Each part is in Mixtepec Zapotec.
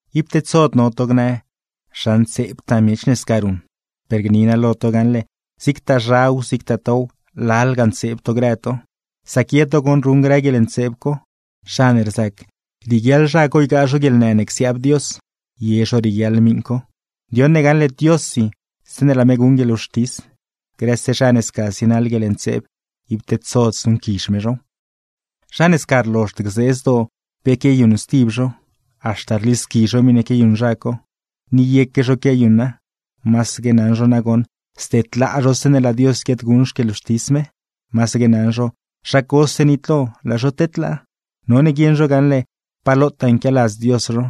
Ib tedsod no to gnë: “¡Zha ntseebtaa miech ne sca ruṉ!” ¡Per gni naa lo to gaṉle, zigtaa zhaw, zigtaa tow, lalga ntseeb to grë to! Sac ye to goṉ ruṉ grë guieḻntseeb co, gacxe waa, zha ne rzac rieguiaḻ zha co ygaa zho guieḻnë ne csiaab Dios, ye zho rieguiaḻ miṉ co. Ndioṉ ne gaṉle Diossi zeeṉe laa me guṉ guieḻwxtis, grëse zha ne sca zienaḻ guieḻntseeb, ib tedsod zuṉquizh me zhow. Zha ne sca rlozhd gzee zdoo pe quiayuṉ stib zho, haxta rlisqui zho miṉe quiayuṉ zha co, ni yeque zho quiayuṉa; masaque naṉ zho nagoṉ zdedlaa zho zeeṉe laa Dios guiaadguṉ xquieḻwxtis me, masaque naṉ zho zha cose nitlo, laa zho tedlaa. None guieṉ zho gaṉle pa lotaa nquialadz Dios zho,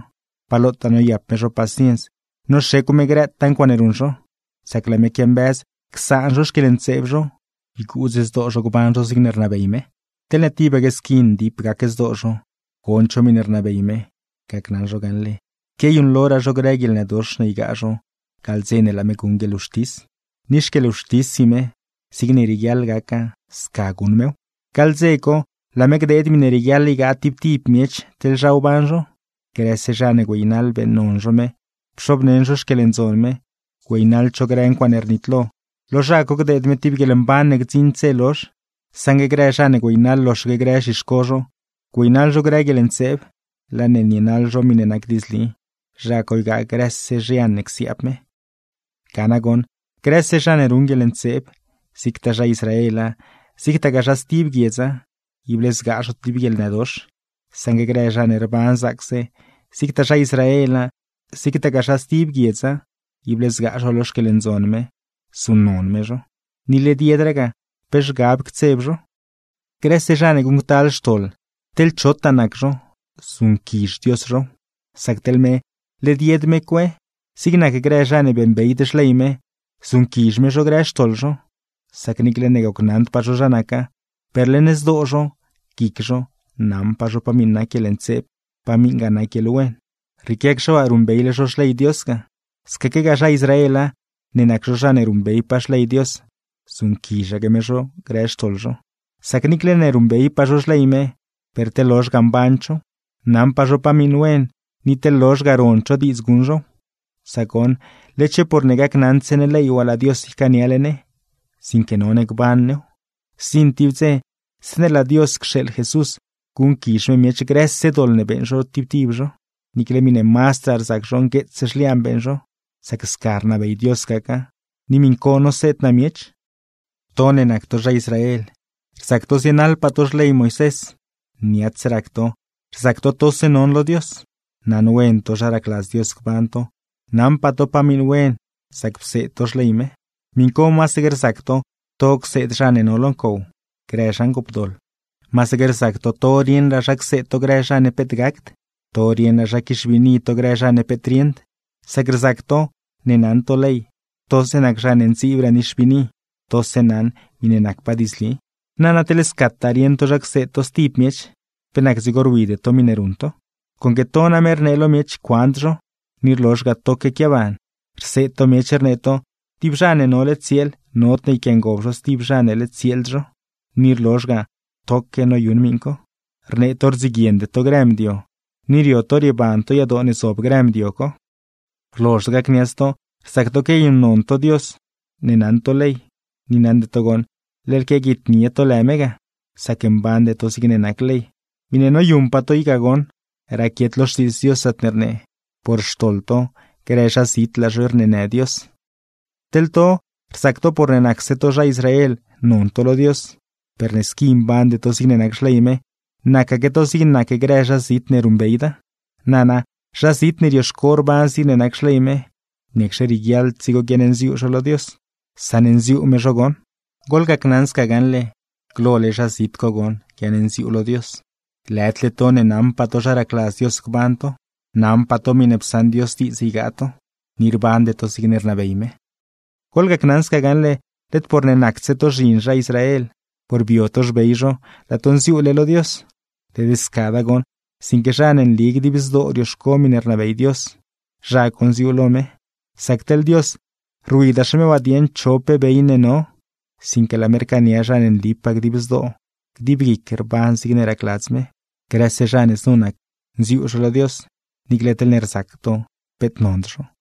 pa lotaa noyap me zho paciens noxecw me grëtaa ncuaaṉe ruṉ zho; sac laa me quiambëz csaan zho xquieḻntseeb zho, yguudz zdoo zho gban zho zigne rnabey me. Teḻne tibaque squi ndip gac zdoo zho, gond zho miṉe rnabey me; gacnaṉ zho gaṉle, quiayuṉloraa zho grë guieḻnëdox ne ygaa zho gaḻ dze ne laa me guṉ guieḻwxtis. Ni xquieḻwxtissi me, zigne rieguiaḻ gaca sca guṉ mew. Gaḻ dze co, laa me gdeed miṉe rieguiaḻ ygaa tib tib miech teḻ zha wban zho. Grëse zha ne güeynaḻ beeṉnon zho lë me, pxobneṉ zho xquieḻndzon me, güeynaḻd zho grë ncuaaṉe rnitlo, lo zha co gdeed me tib guieḻmban ne gdziṉd dze lozh. Saṉgue grë zha ne güeynaḻ loxaque grë zhixco zho, güeynaḻ zho grë guieḻntseeb, laa ne nienaḻ zho miṉe nac diidzli; zha co ygaa grëse zhian ne csiaab me. Ga nagoṉ, grëse zha ne ruṉ guieḻntseeb, zigtaa zha Israela, zigtagaa zha stib guiedza, ible zgaa zho tib guieḻnëdox; saṉgue grë zha ne rban zaacse, zigtaa zha Israela, zigtagaa zha stib guiedza, ible zgaa zho lo xquieḻndzon me, zuṉnon me zho. Ni led yedraa ga pe zhgab ctseb zho. Grëse zha ne guṉctal xtoḻ, teḻ chotaa nac zho zuṉquizh Dios zhow; sac teḻ me, led yed me cue. Zig nac grë zha ne beeṉbeyd xley me, zuṉquizh me zho grë xtoḻ zho; sac niicle ne gocnaṉdpaa zho zha naca, per leṉ zdoo zho, guic zho, naṉpaa zho pa miṉ nac guieḻntseeb, pa miṉgaa nac guieḻwen. Rrieequiacxe waa ruṉbeyle zho xley Dios ga. Scaquegaa zha Israela, ne nac zho zha ne ruṉbeypaa xley Dios, zuṉquizhaque me zho grë xtoḻ zho; sac niicle ne ruṉbeypaa zho xley me, per teḻ lozh ga mband zhow. Naṉpaa zho pa miṉ wen, ni teḻ lozh ga rond zho diidz guṉ zhow; sac goṉ, led-xe por ne gacnaṉdse ne ley waa laa Dios ycaaniale ne, sinque none gban new. Zdziṉ tib dze, zeeṉe laa Dios cxeeḻ Jesús, guṉquizh me miech grëse doḻ ne beeṉ zho tib tib zho, niicle miṉe mazdraa rzac zho ngueets zhliaan beeṉ zho; sac sca rnabey Dios gaca, ni miṉ co noseed naa miech. To ne nac to zha Israel, rzac to zienaḻpaa to xley Moisés, niats rac to, rzac to tose non lo Dios. Naṉwen to zha racladz Dios gban to, naṉpaa to pa miṉ wen sac pseed to xley me. Miṉ co masaque rzac to to cseed zha ne no lo ncow, grë zha ngoopdoḻ. Masaque rzac to to rieṉraa zha cseed to grë zha ne peet gacd, to rieṉraa zha quixbiini to grë zha ne peet rieṉd; sac rzac to ne naṉ to ley, tose nac zha ne ndziibraa nixbiini, tose naṉ miṉe nacpaa diidzli. Nana, teḻ scataa rieṉ to zha cseed to stib miech, ¿pe nac dzigo rwide to miṉe ruṉ to? Conque to name rnee lo miech cuand zho, ni rlozh ga toque quiaban. Rseed to miech rnee to, tib zha ne nole tsieel, nodne yquiangob zho stib zha ne led tsieeld zho; ni rlozh ga toque noyuṉ miṉ co. Rnee to, rdziguiende to grë mdio, ni rio to rieban to yadoo ne zob grë mdio co. Rlozhd gacniats to rzac to quiayuṉnon to lë Dios ne naṉ to ley, ni naṉde to goṉ, leḻ quiaguitnie to lë me ga, sac mbande to zigne nac ley. Miṉe noyuṉpaa to i ga goṉ raquiet lo Xtiidz Dios, zaatne rnee: “Por xtoḻ to, grë zha zit laa zho rneenë Dios.” Teḻ to, rzac to porne nacse to zha Israel non to lo Dios, per ne squi mbande to zigne nac xley me, nacaque to zigne nac grë zha zit ne ruṉbeyda. Nana, zha zit ne rioxco rban zigne nac xley me, ¿niacxe rieguiaḻd dzigo guiaṉnziuu zho lo Dios? Saṉnziuu me zho goṉ. Goḻgacnaṉ sca gaṉle, glole zha zit co goṉ guiaṉnziuu lo Dios, lëdle to ne naṉpaa to zha racladz Dios gban to, naṉpaa to miṉe psaṉ Dios diidz ygaa to, ni rbande to zigne rnabey me. Goḻgacnaṉ sca gaṉle, led porne nacdse to zhin zha Israel, porne bio to xbey zho, laa to nziuule lo Dios. Led scada goṉ, sinque zha ne nli dib zdoo rioxco miṉe rnabey Dios, zha co nziuu lo me. Sac teḻ Dios, rwidaxe me waa dieṉ cho pe bey ne no, sinque laa me rcaania zha ne nlipaa dib zdoo, dib guic, rban zigne racladz me. Grëse zha ne znu nac, nziuu zho lo Dios, niicle teḻne rzac to peet nond zho.